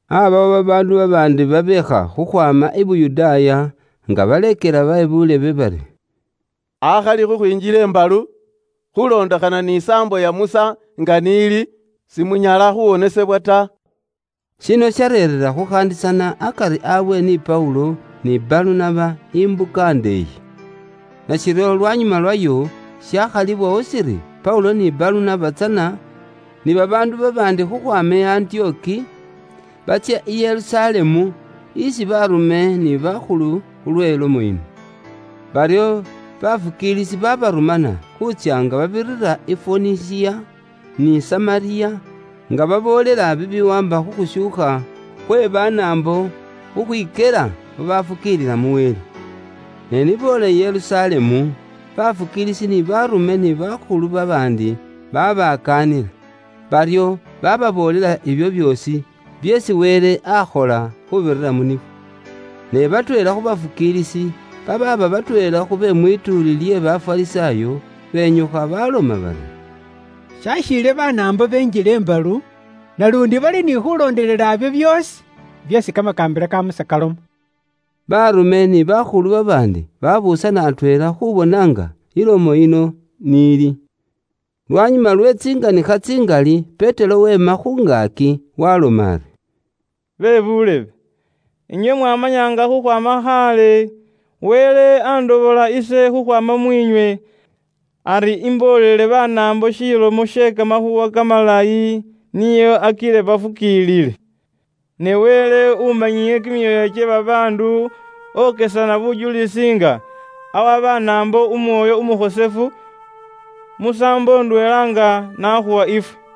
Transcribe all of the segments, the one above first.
Aabawo babaandu babaandi babeekha khukhwaama i Yuda, nga baleekela be buulebe bari, “Akhali khukhwinjila imbalu, khulondekhana ni saambo iya Musa nga n'ili, simunyala khuwonesebwa ta.” Shino shareera khukhaandisana akari abwe ni Paulo ni Balunaba imbuka ndeeyi. Nashiryo lwanyuma lwayo shakhalibwawo shiri Paulo ni Balunaba tsana ni babaandu babaandi khukhwaama i Antiyoki batsye i Yerusalemu isi baarume ni bakhulu khulwe lomo yino. Baryo bafukiilisi baabarumana khuutsya nga babirira i Foyinisiya ni Samariya nga baboolela bibiwaamba khu khushuukha khwe Banaambo khukhwikyela babafukiilila mu Wele. Ne ni boola i Yerusalemu, bafukiilisi ni baarume ni bakhulu babaandi babakaanila. Baryo bababoolela ibyo byoosi byeesi Wele akhola khuubirira mu nibo. Ne batweela khu bafukiilisi, babaaba batweela khu be mwituuli lye Bafarisaayo, benyukha baloma bari, “Shakhiile Banaambo benjile imbalu, naluundi bali ni khulondelela ibyo byoosi byeesi kamakaambila ka Musa kaloma.” Baarume ni bakhulu babaandi babuusana atweela khuubona nga ilomo yino n'ili. Lwanyuma lwe tsinganikha tsingali, Petero weema khu ngaaki waaloma ari, “Bebuulebe, inywe mwamanya nga khukhwaama khaale, Wele andobola ise khukhwaama mwiinywe ari imboolele Banaambo shilomo she kamakhuuwa kamalayi nio akile bafukiilile. Ne Wele umanyile kimyoyo kye babaandu okesana bujulisi nga awa Banaambo Umwoyo Umukhosefu, musaambo ndweela nga n'akhuwa ifwe.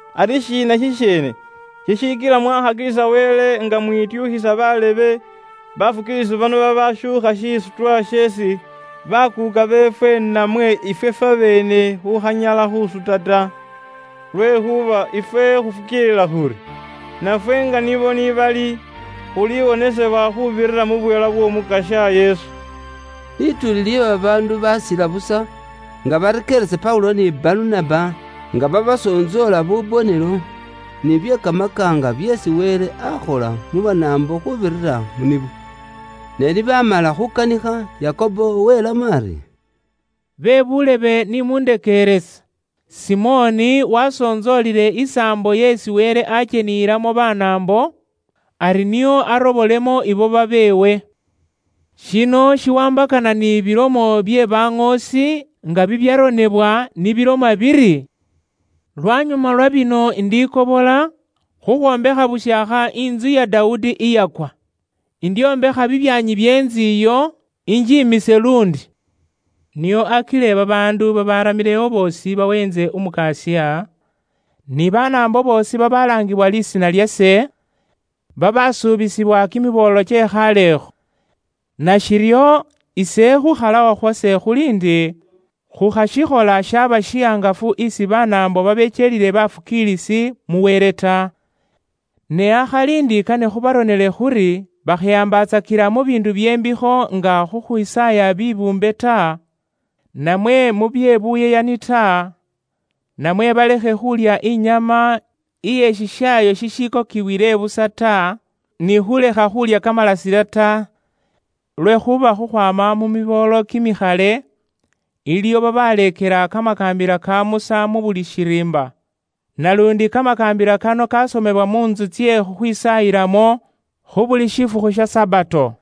Ari shiina shisheene shishikila mwakhakilisa Wele nga mwityukhisa baleekelwa bano babashuukha shisutwa sheesi bakuuka beefwe namwe ifwe fwabeene khukhanyala khusuta ta. Lwekhuuba ifwe khufukiilila khuri, nafwe nga nibo ni bali, khuliwonesebwa khuubirira mu bweela bw'Omukasya Yesu.” Lituuli lye babaandu baasila busa nga barekeeresa Paulo ni Balunaba nga babasontsoola bubonelo ni bye kamakaanga byeesi Wele akhola mu Banaambo khuubirira mu nibo. Ne ni baamala khuukanikha, Yakobo welamo ari, “Bebuulebe ni mundekeerese. Simoni wasontsoolile isaambo yeesi Wele akyeniyilamo Banaambo, ari nio arobolemo ibo babeewe. Shino shiwaambakana ni bilomo bye baŋoosi nga bibyaronebwa ni biloma biri, ‘Lwanyuma lwa bino indikobola, khukhwombekha bushaakha intsu ya Dawudi iyakwa. Indyombekha bibyaanyi bye intsu iyo, injimise luundi. Nio akile babaandu babaramilewo boosi baweentse Umukasya, ni Banaambo boosi babalaangibwa lisiina lyase, babaasuubizibwa kimiboolo kye khaalekho.’ “Nashiryo, ise khuukhalawo khwase khuli ndi, khukhashikhola shaaba shihangafu isi Banaambo babekyelile bafukiilisi mu Wele ta. Ne akhali ndi kane khubaronele khuri bakhehambatsakila mu biindu bye mbikho nga khukhwisaaya bibuumbe ta, namwe mu bye buyeyani ta, namwe balekhe khulya inyama iye shishaayo shishikokibwile busa ta, ni khulekha khulya kamalasile ta. Lwekhuuba khukhwaama mu miboolo kimikhale, iliwo babaleekela kamakaambila ka Musa mu buli shiriimba. Naluundi kamakaambila kano kasomebwa mu ntsu tsye khukhwisaayilamo khu buli shifukhu sha Sabato.”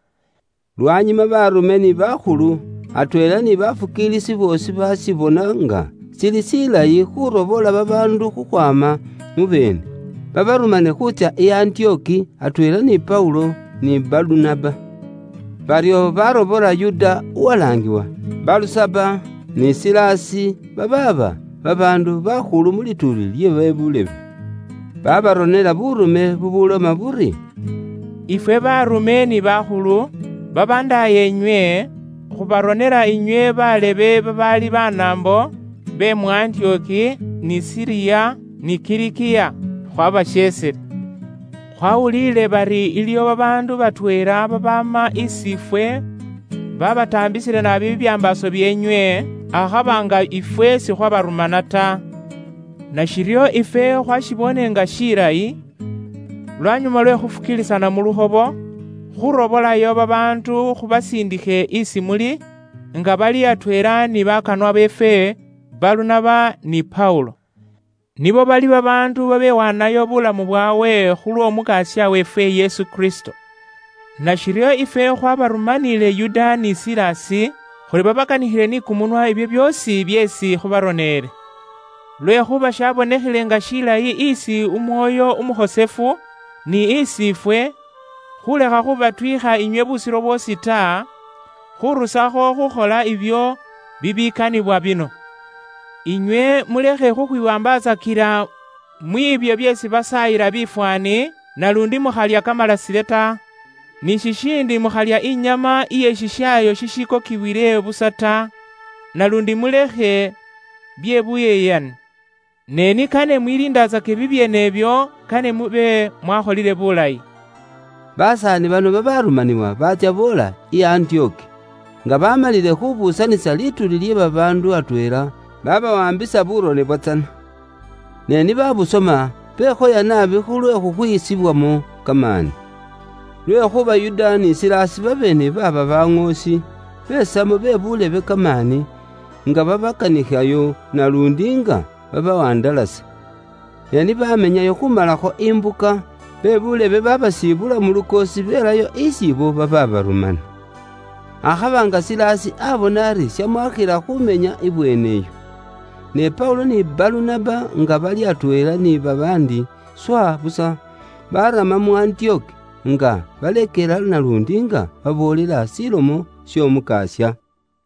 Lwanyuma baarume ni bakhulu, atweela ni babaafukiilila boosi baashibona nga shili shilayi khuurobola babaandu khukhwaama mu beene, babarumane khuutsya i Antiyoki, atweela ni Paulo, ni Balunaba. Baryo barobola Yuda uwalaangiwa Balusaba, ni Silasi, babaaba babaandu bakhulu mu lituuli lye be buulebe. Baabaronela buurume bubuloma buri: “Ifwe baarume ni bakhulu, babandaayeenywe, khubaronela inywe balebe babaali Banaambo, be mu Antiyoki, ni Siriya, ni Kilikiya. Khwabasheesile. “Khwaawuliile bari iliwo babaandu batweela babaama isi ifwe baabataambisile naabi bibyambaaso byeenywe, akhaba nga ifwe sikhwabarumana ta. Nashiryo ifwe khwashiboone nga shilayi, lwanyuma lwe khufukiilisana mu lukhobo, khurobolayo babaandu khubasindikhe isi muli, nga bali atweela ni bakanwa beefwe Balunaba ni Paulo. Nibo bali babaandu babewaanayo bulamu bwaabwe khulw'Omukasya weefwe Yesu Kristo. Nashiryo ifwe khwabarumaniile Yuda ni Silasi, khuri babakanikhile ni kumunwa ibyo byoosi byeesi khubaroneele. Lwekhuuba shabonekhele nga shilayi isi Umwoyo Umukhosefu, ni isi ifwe, khulekha khubatwiikha inywe busiro bwoosi ta, khurusakho khukhola ibyo bibikanibwa bino: Inywe mulekhe khukhwiwaambatsakila mwiibyo byeesi basaayila bifwaani, naluundi mukhalya kamalasile ta. Ni shishiindi mukhalya inyama iye shishaayo shishikokibwile busa ta, naluundi mulekhe bye buyeyani. Ne ni kane mwiliindatsake bibyeene ibyo kane mube mwakholile bulayi.” Basaani bano babaarumanibwa baatsya boola i Antiyoki. Nga baamalile khubuusanisa lituuli lye babaandu atweela, babawaambisa burone bwatsana. Ne ni babusoma, bekhoya naabi khulwe khukhwisibwamo kamaani. Lwekhuuba Yuda ni Silasi babeene baaba baŋoosi, besamo be buulebe kamaani, nga babakanikhayo naluundi nga babawandalasa. Ne ni bamenyayo khumalakho imbuka, be buulebe babasibula mu lukoosi belayo isi ibo bababarumana. Akhaba nga Silasi abona ari shamwakhila khumenya ibweene iyo. Ne Paulo ni Balunaba nga bali atweela ni babaandi swa busa, baarama mu Antiyoki, nga baleekela naluundi nga baboolela Ilomo y'Omukasya.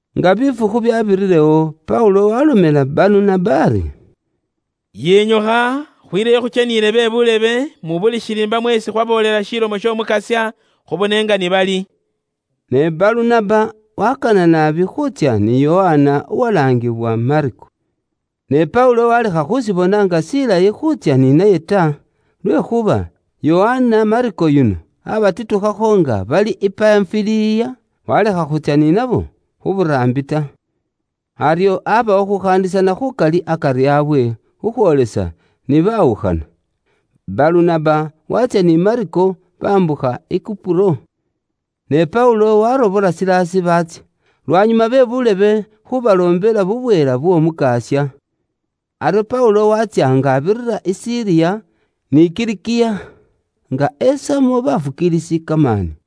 Nga bifukhu byaabirirewo, Paulo waalomela Balunaba ari “Yinyukha, khwileyo khukyeniyile be buulebe mu buli shiriimba mweesi khwaboolela Ilomo y'Omukasya khubone nga ni bali.” Ne Balunaba waakana naabi khuutsya ni Yokana uwalaangibwa Mako. Ne Paulo waalekha khushibona nga shilayi khuutsya ni naye ta, lwekhuuba Yokana Mako yuno aabatitukhakho nga bali i Panfiliya, waalekha khutsya ni nabo khu buraambi ta. Aryo aabawo khuukhaandisana khuukali akari aabwe, khukhwoolisa ni baawukhana. Balunaba waatsya ni Mako, baambukha i Kupuro. Ne Paulo waarobola Silasi baatsya, lwanyuma be buulebe khuubaloombela bubweela bw'Omukasya. Aryo Paulo waatsya nga abirira i Siriya, ni Kilikiya, nga esamo baafukiilisi kamaani.